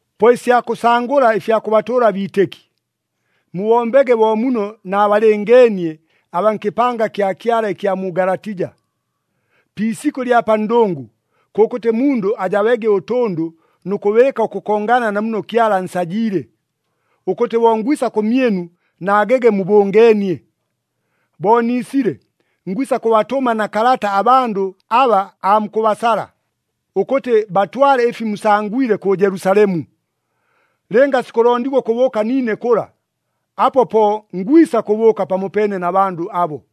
Po ɨsya kʉsangʉla ɨfya kʉbatʉʉla abiitɨki, mubombege bo muno naabalɨngeenie abaa nkɨpanga kya Kyala ɨkya mu Galatija. Pi isikʉ ɨlya pa ndʉngʉ, kʉkʉtɨ mundʉ ajabege ʉtʉndʉ nʉ kʉbɨɨka ʉkʉkongana na muno Kyala ansajiile, ʉkʉtɨ bo ngwisa kʉmyɨnu naagege mubʉngeenie. Bo niisile, ngwisa kʉbatʉma na kalata abandʉ aba aamukʉbasala, ʉkʉtɨ batwale ɨfi musangwile kʉ Jelusalemu. Lɨnga sikʉlondigwa ʉkʉbʉʉka niine kʉla, apo po ngwisa kʉbʉʉka pamopeene na bandʉ abo.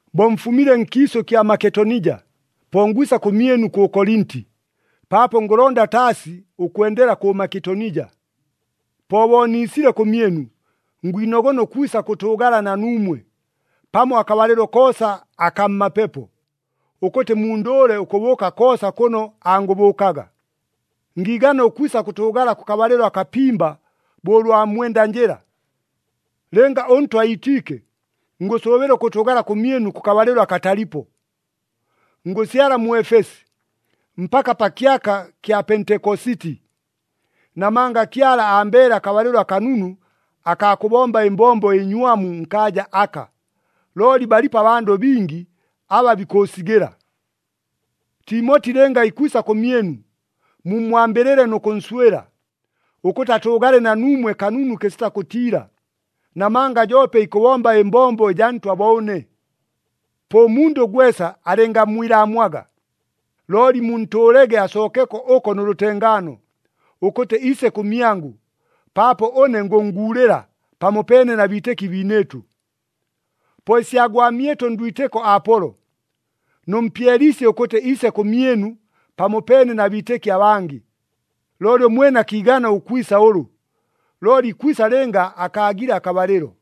Bo mfumile nkiisʉ kya Maketonija, po ngwisa kʉmyɨnu kʉ Kolinti, paapo ngʉlonda taasi ʉkwendela kʉ Maketonija. Po bo niisile kʉmyɨnu, ngwinogona ʉkwisa kʉtʉʉgala na nuumwe, pamo akabalɨlo koosa akaa mmapepo, ʉkʉtɨ mundʉʉle ʉkʉbʉʉka koosa kʉno angʉbʉʉkaga. Ngiigana ʉkwisa kʉtʉʉgala kʉkabalɨlo akapimba bo ʉlwa mwenda njɨla. Lɨnga ʉNtwa iitiike, ngʉsʉʉbɨla ʉkʉtʉʉgala kʉmyɨnu kʉkabalɨlo akatalipo. Ngʉsyala mu Efesi, mpaka pa kyaka kya Pentekositi. Namanga Kyala ambeele akabalɨlo akanunu akaa kʉbomba ɨmbombo ɨnywamu nkaaja aka, looli balipo abandʉ bingi aba bikʉʉsigɨla. Timoti lɨnga ikwisa kʉmyɨnu, mummwambɨlɨle nʉ kʉnswɨla, ʉkʉtɨ atʉʉgale na nuumwe kanunu kɨsita kʉtiila, namanga joope ikʉbomba ɨmbombo ɨjaa Ntwa bo ʉne. Po ʉmundʉ gwesa alɨngammwilaamwaga. Looli muntʉʉlege asookeko ʉko nʉ lʉtengaano, ʉkʉtɨ iise kʉmyangʉ, paapo ʉne ngʉnnguulɨla pamopeene na biitɨki biinɨɨtʉ. Po ɨsya gwamyɨtʉ ndwitɨko Apolo, nʉmpyeliisye ʉkʉtɨ iise kʉmyɨnu pamopeene na biitɨki abangɨ. Looli ʉmwene akiigana ʉkwisa ʉlʉ, looli ikwisa lɨnga akaagile akabalɨlo.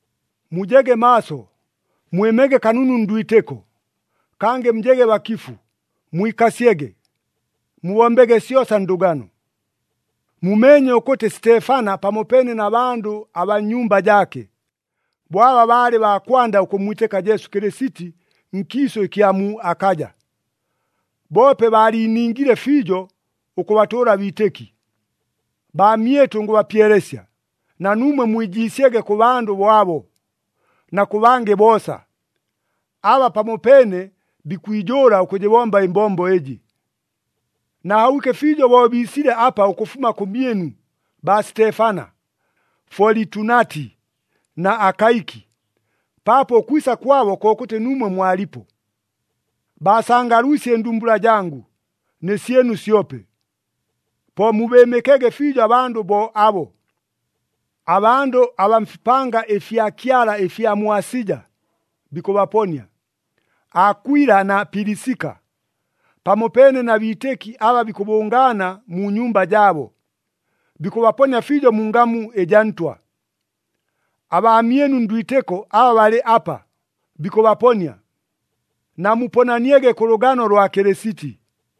Mujege maaso, mwɨmege kanunu ndwitɨko, kangɨ mujege bakifu, mwikasyege. Mubombege syosa ndʉgano. Mumeenye ʉkʉtɨ Sitefana pamopeene na bandʉ abaa nnyumba jaake, bo aba baalɨ baa kwanda ʉkʉmmwitɨka Jesu Kɨlɨsiti nkiisʉ ɨkya mu Akaja, boope baaliiningile fiijo ʉkʉbatʉʉla abiitɨki! Baamyɨtʉ ngʉbapyelesya, na nuumwe mwijiisyege kʉ bandʉ bo abo, na kʉ bangɨ boosa, aba pamopeene bikwijʉʉla ʉkʉjɨbomba ɨmbombo ɨjɨ. Naahobwike fiijo bo biisile apa ʉkʉfuma kʉmyɨnu, baa Sitefana, Folitunati na Akaiki, paapo ʉkwisa kwabo kokʉtɨ nuumwe mwalipo. Baasangalwisye ɨndumbula jangʉ, nɨ syɨnu syope. Po mubɨɨmɨkege fiijo abandʉ bo abo. Abandʉ abaa mfipanga ɨfya Kyala ɨfya mu Asija, bikʉbaponia. Akwila na Pilisika, pamopeene na biitɨki aba bikʉbʉngaana mu nyumba jaabo, bikʉbaponia fiijo mu ngamu ɨjaa Ntwa. Abaamyɨnu ndwitɨko aba balɨ apa, bikʉbaponia. Namuponaniege kʉ lʉgano lwa Kɨlɨsiti.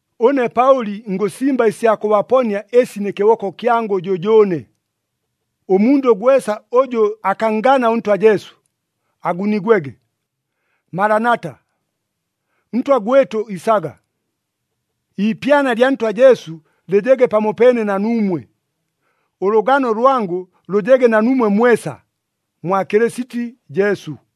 Ʉne Paʉli ngʉsimba ɨsya kʉbaponia ɨsi nɨ kɨboko kyangʉ jʉjʉʉne. Ʉmundʉ gwesa ʉjʉ akanngana ʉNtwa Jesu, agunigwege. Malanata, Ntwa gwɨtʉ isaga! Iipyana lya Ntwa Jesu lɨjege pamopeene na nuumwe. Ʉlʉgano lwangʉ lʉjege na nuumwe mwesa, mwa Kɨlɨsiti Jesu.